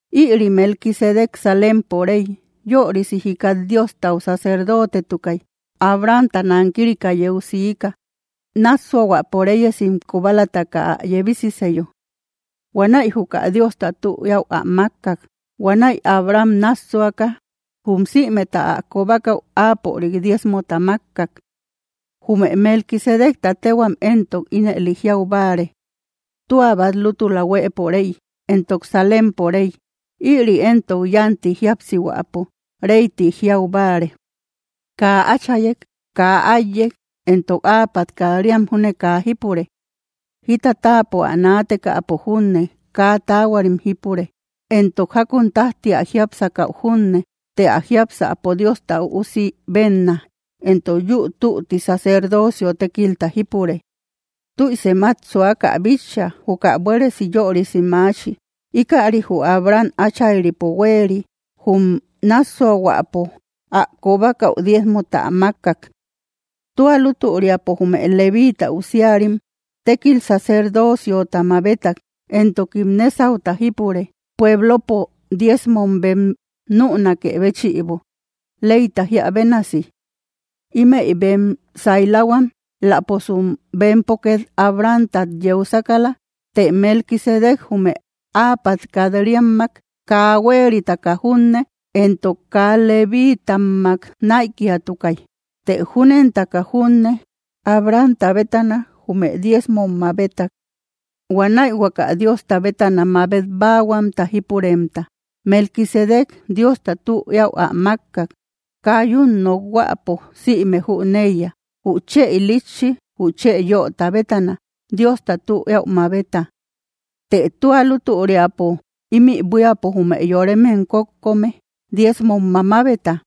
Ïri Melquisedec Salempo rey, yörisi jikat Diostau sacerdotetukay. Abrahamta nankirika yeu siika, nássuahuäpo reyesim kobalataka ä yebisiseyo. Huanäi juka Diosta tü eäu ä mákkak. Huanäi Abraham nássuaka jum sïmeta ä kobakäu áapörik diezmota mákkak. Jume Melquisedecta téhuam éntok ínëlim jiau báare “tua bát lútula huëpo rey”; entok Salempo rey, ïri éntok yánti jíapsihuäpo “rey ti jiau báare”. Kaa áchayek, kaa áiyek, entok áapat kat‑riam júne kaa jípure; jita táapo ä naatekäpo júne kaa taahuarim jípure, entok jákun tájti ä jiápsakäu junne. Të ä jiápsäpo Diosta Üusi bénna, entok yúu tütti sacerdocio tékilta jípure. Tüisem át suaka ä bitcha, juka buéresi yörisi maachi. Íkäri jü Abraham áchayripo huéeri, jum nássuahuäpo ä kobakäu diezmota ä mákkak. Tua lútüriapo jume Levíita usiarim tékil sacerdociota mabetak, entokim nésauta jípure, pueblopo diezmom bem nünakë béchïbo, leyta jíä bénasi. Ímëi bem saylahuam, éläposum bempo két Abrahamtat yeu sákala. Të Melquisedec jume áapat kat‑riammak kaa huéritaka junne, entok kaa Levitammak näikiatukay. Të júnentaka junne, Abrahamta bétana jume diezmom mabetak. Huanäi huaka Diosta bétana mabet báahuamta jípuremta, Melquisedec Diosta tü eäu ä mákkak. Kaa yún nokhuäpo sïme jüneiya: jü chë ilitchi jü chë yöta bétana Diosta tü eäu mabeta. Të tua lútüriapo ímï buíapo jume yoremem kokókko me diezmom mamabeta;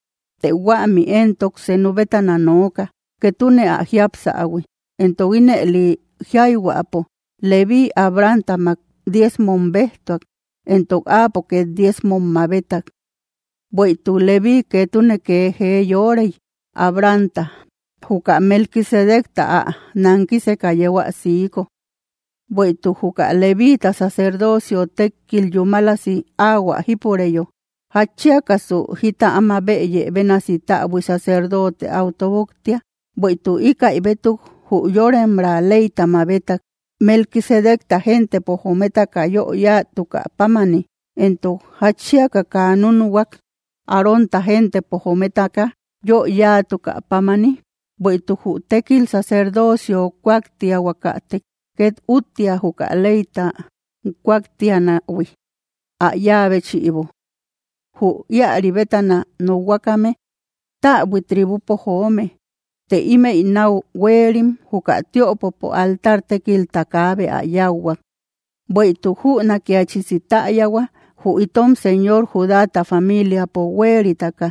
të huämi éntok senuk bétana nooka, ketune ä jiapsähui. Entok ínëli jiayhuäpo, Levíi Abrahamtamak diezmom béjtuak, entok áapo két diezmom mabeta. Bueïtuk Levíi ketune kee jee yorei Abrahamta, juka Melquisedecta ä nankiseka yeu ä siiko. Bueïtuk juka levíita sacerdocio tékil yúmalasi áhuä jípureyo, ¿jatchiakasu jita áma bëye bénasi täbui sacerdote áu tóboktia, bueïtuk ïkäi bétuk jü yoremraa leyta mabetak, Melquisedecta gentepo jometaka yö yáatukä pámani? Entok, ¿jatchiaka kaa núnuhuak, Arónta gentepo jometaka yö yáatukä pámani? Bueïtuk jü tékil sacerdocio kúaktiahuakatek, két úttia juka leyta kúaktianähui ä yáa béchïbo. Jü íäri bétana nokhuakame täbui tribupo joome; të ímëi náu huéerim juka tiöpopo altar tékilta, kaabe ä yáuhuak. Bueïtuk jünakiachisi täyahua, jü itom Señor Judáta familiapo huéritaka.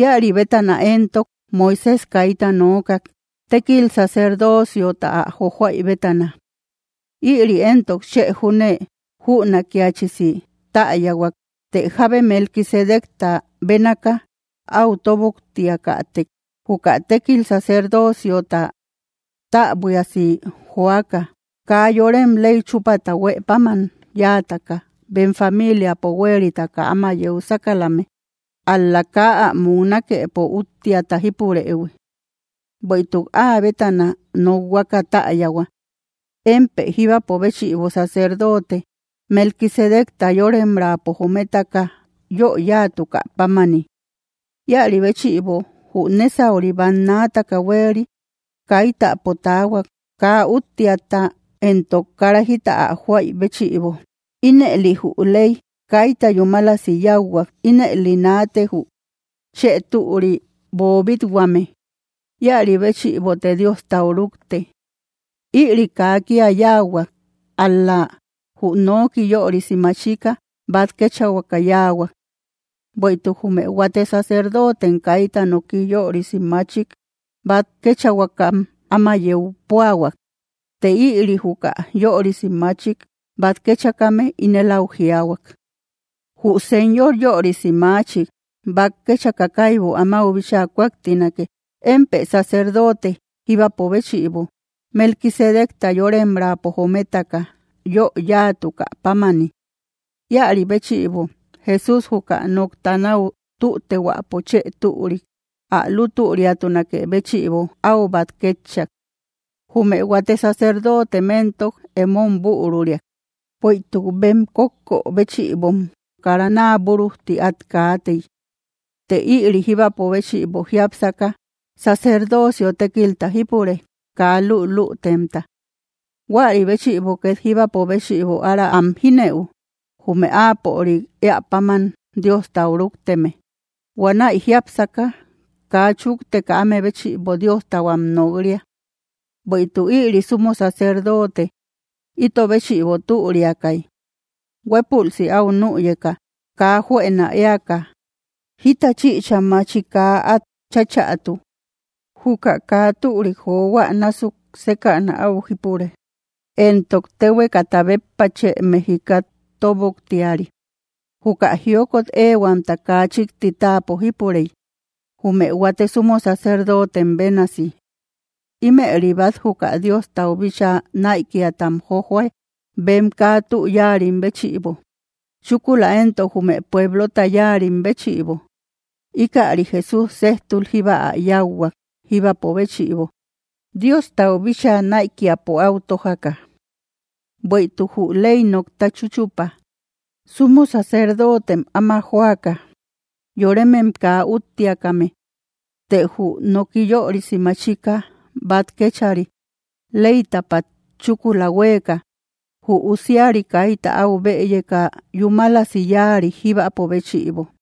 Íäri bétana éntok Moisés kaita nookak, tékil sacerdociota ä jojoaï bétana. Ïri éntok chë júne jünakiachisi täyahuak, të jábe Melquisedecta bénaaka áu tóboktiakätek, juka tékil sacerdociota täbuiasi joaka. Kaa yorem ley chúpata huë páman yáataka bem familiapo huéritaka áma yeu sákalame, ál‑la kaa ä muknakepo úttiata jípurëhui. Bueïtuk áa bétana nokhuaka täyahua: Émpë jíbapo béchïbo sacerdote, Melquisedecta yoremraapo jometaka yö yáatukä pámani. Íäri béchïbo jü nésauri bannaataka huéeri kaitäpo taahuak, kaa úttiata entok kara jita ä joaï béchïbo. Ínëli jü ley kaita yúmalasi yáuhuak. Ínëli naate jü chë türi boobit-huame; íäri béchïbote Diostau rukte. Ïri kaa kía yáahuak, ál‑la jü noki yörisi machika bát kéchahuaka yáahuak. Bueïtuk jume huate sacerdotem kaita noki yörisi machik bát kéchahuakam áma yeu púahuak. Të ïri, juka yörisi machik bát kéchakame ínel áu jiaahuak: Jü Señor yörisi machik bát kéchaka, kaibu amáu bíchaa kúaktinake: “Émpë sacerdote jíbapo béchïbo, Melquisedecta yoremraapo jometaka yö yáatukä pámani.” Íäri béchïbo Jesús juka nokta náu tütehuäpo chë türik, ä lútüriatunakë béchïbo, áu bát kétchak. Jume huate sacerdotem éntok emom büruriak, bueïtuk bem kókkö béchïbom kara naa búrujti át kaatey. Të ïri, jíbapo béchïbo jiápsaka, sacerdocio tékilta jípure, kaa lülütemta. Huäri béchïbo két jíbapo béchïbo ára am jínëu, jume áapörik éä páman Diostau rúkteme, huanäi jiápsaka kaa chúkteka áme béchïbo Diostau am nok‑ria. Bueïtuk ïri sumo sacerdote ito béchïbo türiakay: huépülsi áu nüyeka, kaa juënak éaka, jita chïcha machi kaa át cháchätu. Juka kaa türik johuä násuk sékäna áu jípure, entok téhuekata béppa chë mejikat tóboktiari. Juka jiokot éehuamta kaa chíkti táapo jipurey, jume huate sumo sacerdotem bénasi. Ímëri bát juka Diostau bíchaa näikiatam jojoa, bem kaa tü yáarim béchïbo, chúkula éntok jume pueblota yáarim béchïbo. Íkäri Jesús séjtul jíba ä yáuhuak jíbapo béchïbo, Diostau bíchaa näikiapo áu tójaka. Bueïtuk jü ley nokta chúchupa, sumo sacerdotem áma joaka, yoremem kaa úttiakame; të jü noki yörisi machika bát kéchari, leytapat chúkula huéeka, jü usiari kaita áu bëyeka yúmalasi yáari jíbapo béchïbo.